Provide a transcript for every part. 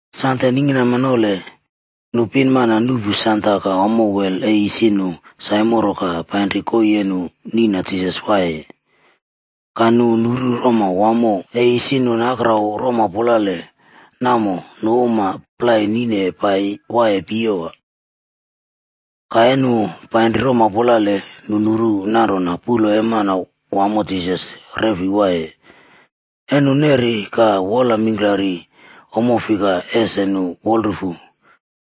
Sande ningkinama nole, nu pinmana nuꞌpu sanda ka ommo wel e isi none saimoro ka painri koii e nu nina Jisas waiyeye. Ka nu nuru roma wamo e isi nu nakrau rompulale namo nu uma plai nine pai waiye piyewa. Ka e nu panri rompulale, nu nuru nanrona puꞌlo e Manawamo Jisas re fei waiye. E nu nerine ka wol mingklari ommo fika ese nu wolrufu,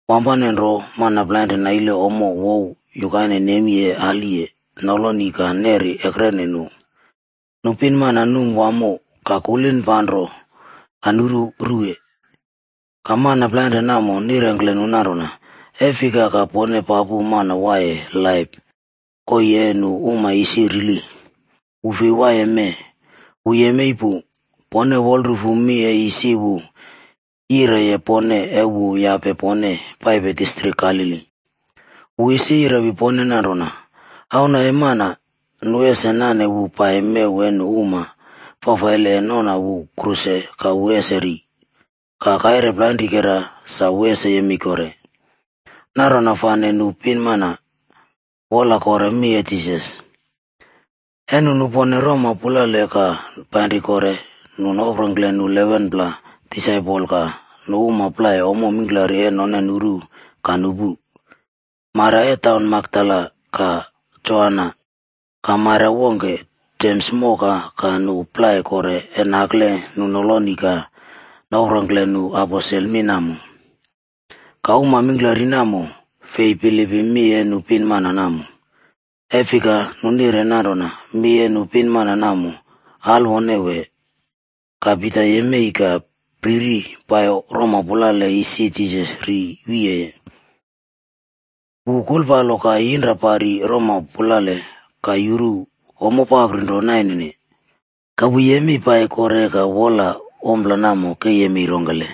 wampane nro mana plainren naile ommo wow yukaine nemi e aliye noloni ka neri ekrene nu. Nu pinmana num wamo ka kulipanro ka nuru ruwe. Ka mana plainren namo nirengkle nu nanrona, “E fika ka pone papu mana waiye laip koii e nu uma isi rili? Wu fei waiye mee, wu yemei pu. Pone wolrufu mi e isi wu yireliye pone e wu yape pone paipepe distrik Galili. Wu isi yirewi pone nanrona, ‘Auna e Mana, nu ese nane wu pai mew e nu uma e nangke nale fafaile ka nu ese noꞌna wu kruse ka wu ese ri. Ka kaire plainrikera sa wu ese yemei kore.’” Nanrona fane nu pinmana, wola kore mi e Jisas. E nu nupone rompulale ka painri kore, nu noprongkle nu 11pla disaipol ka nu uma plai ommo mingklari e none nuru ka nupu. Maria e taun Makdala, ka Joana ka Maria wongke Jems moka ka nu plai kore e nakle nu noloni noprongkle nu aposel mi namo. Ka uma mingklari namo, fei bilipim mi e nu pinmana namo. E fika nu nire nanrona mi e nu pinmana namo alwone wee. Ka Pita yemei ka priri pai roma pulale isi Jisas ri wiyeye. Wu kulpalo ka yinra pari roma pulale ka yuru ommo amprapi nro nainene. Ka wu yemei pai kore ka wolaye ompla namo ke yemei rongkele.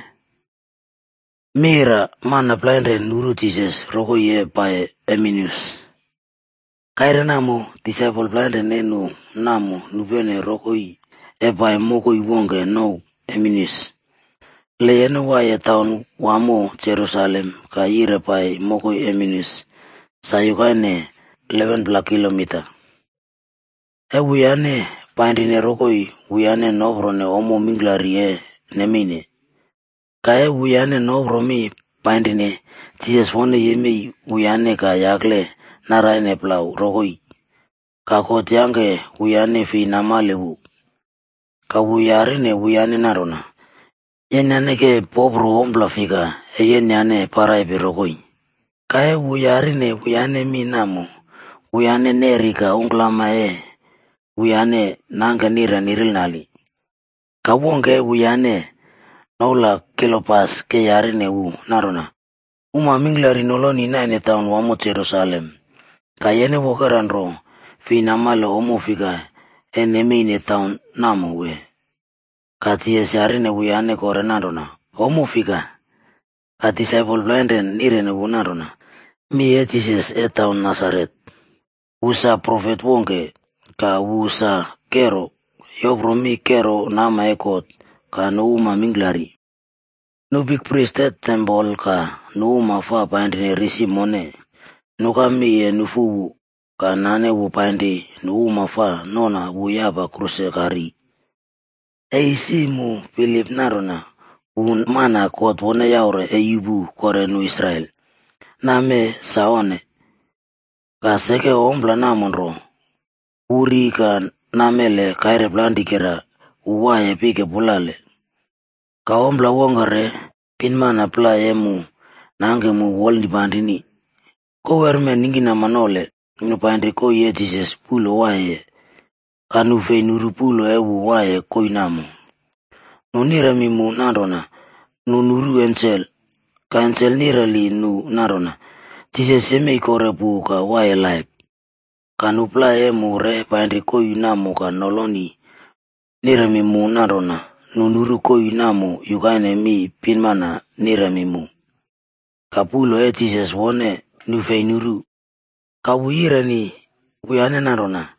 Mana plainren nuru Jisas rokoi e paiye Emeus. Kaire namo, disaipol plainre e nu namo nupene rokoi e pai mokoi wongke nouw Emeus. Le yene waiye taun wamo Jerusalem ka yire pai mokoi Emeus sa yukaine 11pla kilomita. E wuyane painrine rokoi, wuyane noprone ommo mingklari e nemeine. Ka e wuyane nopro mi painrine, Jisas wone yemei wuyane ka yakle naraine plau rokoi. Ka God yangke wuyane fei namale wu. Ka wu yarine wuyane nanrona, “Yenyane ke popro ompla fika, e yenyane paraipe rokoi?” Ka e wu yarine wuyane mi namo, wuyane neri ka ungklama e wuyane nangke nire nirinale. Ka wongke e wuyane, noula Kliopas ke yarine wu nanrona, “Uma mingklari noloni naine taun wamo Jerusalem ka yene wokera nro fei namale ommo fika e nemeine taim namo wee?” Ka Jisas yarine wuyane kore nanrona, “Ommo fika?” Ka disaipol plainren nireni wu nanrona, “Mi e Jisas e taun Nasaret. Wu sa profet wongke, ka wu sa kero, yopro mi kero nama e God ka nu uma mingklari. Nu bikpris e tempol ka nu uma fa painri risi mone, nuka mi e nufu wu ka nane wu painri nu uma fa noꞌna wu yapa kruse ka ri. E isi mu bilip nanrona wu mana God wone yaure e yuꞌpu kore nu Israel. Namee sa onne. Ka seke ompla namo nro, wu ri ka namele kaire plainrikeraa wu waiye pike pulale. Ka ompla wongke re, pinmana plai e mu nangke mu wolnipanrini. Kowerme ningkinama nole, nu painri koii e Jisas puꞌlo waiyeye. Ka nu fei nuru puꞌlo e wu waiye koii namo. Nu niremi mu nanrona nu nuru ensel, ka ensel nireli nu nanrona Jisas yemei kore pu ka waiye laip. Ka nu plai e mu re painri koii namo ka noloni niremi mu nanrona nu nuru koii namo yukaine mi e pinmana niremi mu. Ka puꞌlo e Jisas wone, nu fi nuru.” Ka wu yireni wuyane nanrona,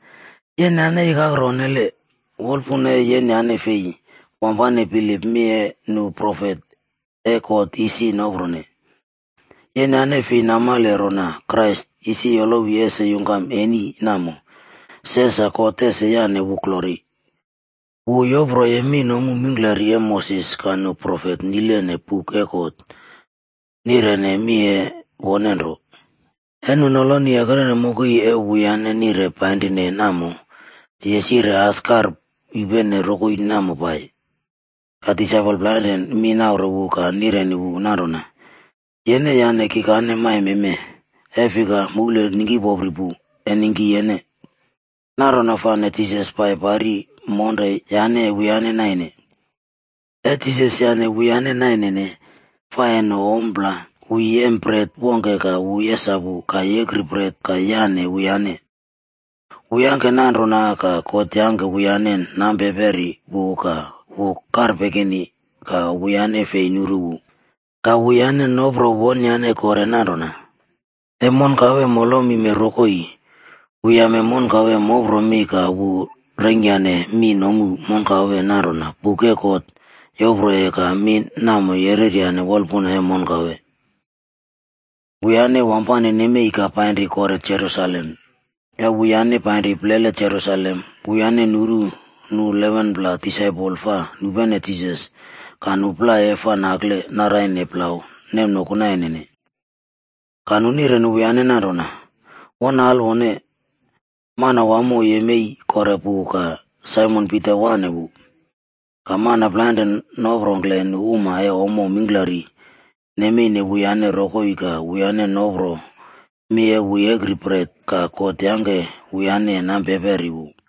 “Yenyane ikakro onnele. Wolpuna e yenyane fi wampane bilipim mi e nu profet e God isi noprone. Yenyane fei namale rona Kraisb isi yolowi ese yungkam eni namo, se sa God ese yane wu glori?” Wu yoproye mi nomu mingklari e Moses ka nu profet nilene buk e God, nirene mi e wone nro. E nu noloni ekrene mokoi e wuyane nire painrine namo, Jisas yire as kar yupene rokoi namo pai. Ka disaipol plainren mi naure wu ka nireni wu nanrona, “Yene e yane kikane maime mee, e fika moul ningkipopri pu, e ningki yene.” Nanrona fane Jisas pai pari monre yane wuyane naine. E Jisas yane wuyane nainene fa e no ompla, wu yem bret wongke ka wu yesapu ka yekri bret ka yane wuyane. Wu yangke nanrona ka God yangke wuyane nampeperi wu ka wu karpekini ka wuyane fei nuru wu. Ka wuyane nopro wonyane kore nanrona, “E monkawe molomime rokoi, wu yame monkawe mopro mi ka wu yeingkyane mi nomu monkawe nanrona buk e God yoproye ka mi namo yereryane wolpuna e monkawe.” Wuyane wampane nemei ka painri kore Jerusalem. E wuyane painri plele Jerusalem, wuyane nuru nu 11pla disaipol fa nupene Jisas ka nu plai e fa nakle naraine plau nemnoku nainene. Ka nu nireni wuyane nanrona, “Won alwone! Manawamo yemei kore pu ka Saimon Pita wane wu.” Ka mana plainren noprongkle nu uma e ommo mingklari nemeine wuyane rokoi ka wuyane nopro mi e wu yekri bret ka God yangke wuyane nampeperi wu.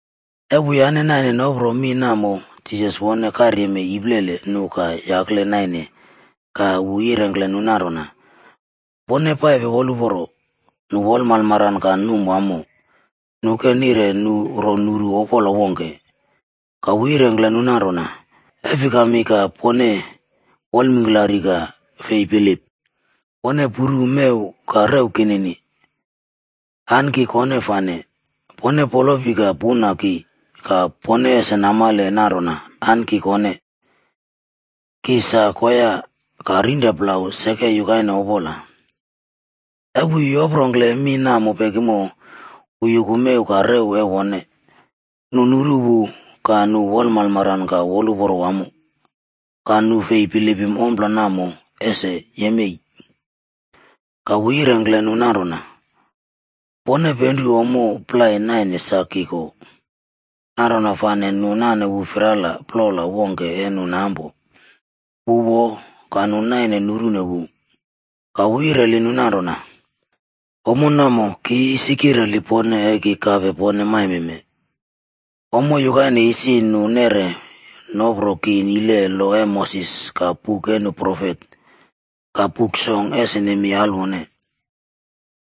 E wuyane naine noprone mi namo, Jisas wone karyemei iplele nu ka yakle naine ka wu yirengkle nu nanrona, “Pone paipe wolraulo.” Nu wolmalmaran ka num wamo. Nu ke nire nu ro nuru opola wongke. Ka wu yirengkle nu nanrona, “E fikami ka pone wolmingklari ka fei bilip? Pone puru mew ka rew kinini. An ki kone fane! Pone polopi ka puna ki ka pone ese namale nanrona an ki kone. Ki sa koya ka rinra plau seke yukaine opola.” E wu yoprongkle mi namo pekimo, wu yuku mew ka rew e wone. Nu nuru wu ka nu wolmalmaran ka woluporo wamo, ka nu fei bilipim ompla namo ese yemei. Ka wu yirengkle nu nanrona, “Pone penru ommo plai naine sa ki ko?” Nanrona fane nu nane wu firala plola wongke e nu nampo, wu wo, ka nu naine nurune wu. Ka wu yireli nu nanrona, “Ommo namo ki isi kireli pone e ki kape pone maimeme. Ommo yukaine isi nu neꞌre nopro ki nilene lo e Moses ka buk e nu profet ka Buk Song ese nemei alwone.”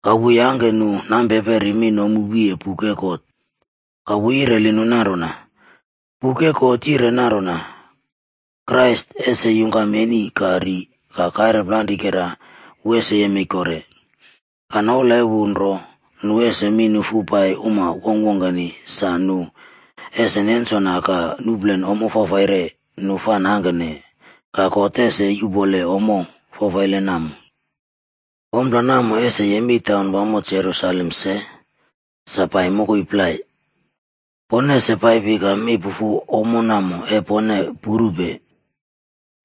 Ka wu yangke nu nampeperi mi nomu wiye buk e God. Ka wu yireli nu nanrona, “Buk e God yire nanrona: Krais ese yungkam eni ka ri ka kaire plainrikera, wu ese yemei kore. Ka noula e wu nro nu ese mi nufu pai uma wongkwongkeni sa nu ese nensona ka nuplen ommo fafaire nu fa nangkene ka God ese yupone ommo fafaile namo. Ompla namo ese yemei taunwamo Jerusalem se, sa pai mokoi plai. Pone ese paipi ka mi pufu ommo namo e pone purupe.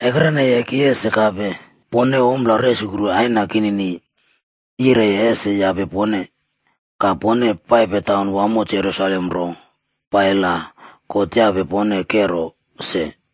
Ekreneye ki ese kape pone ompla resukru Aina kinini yireye ese yape pone. Ka pone paipe taun wamo Jerusalem nro pai la God yape pone kero se.”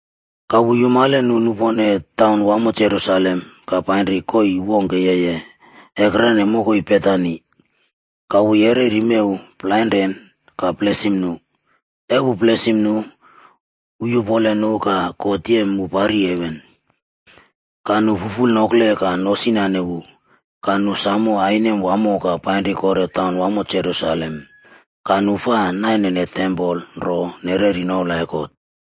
Ka wu yumale nu nupone taun wamo Jerusalem ka painri koii wongke yeye ekrene mokoi Betani, ka wu yereri mew plainre ka blesim nu. E wu blesim nu, wu yupole nu ka God yem wu pari heven. Ka nu fuful nokle ka nosinane wu, ka nu sam ainem wamo ka painri kore taun wamo Jerusalem. Ka nu fa nainene tempol nro nereri noula e God.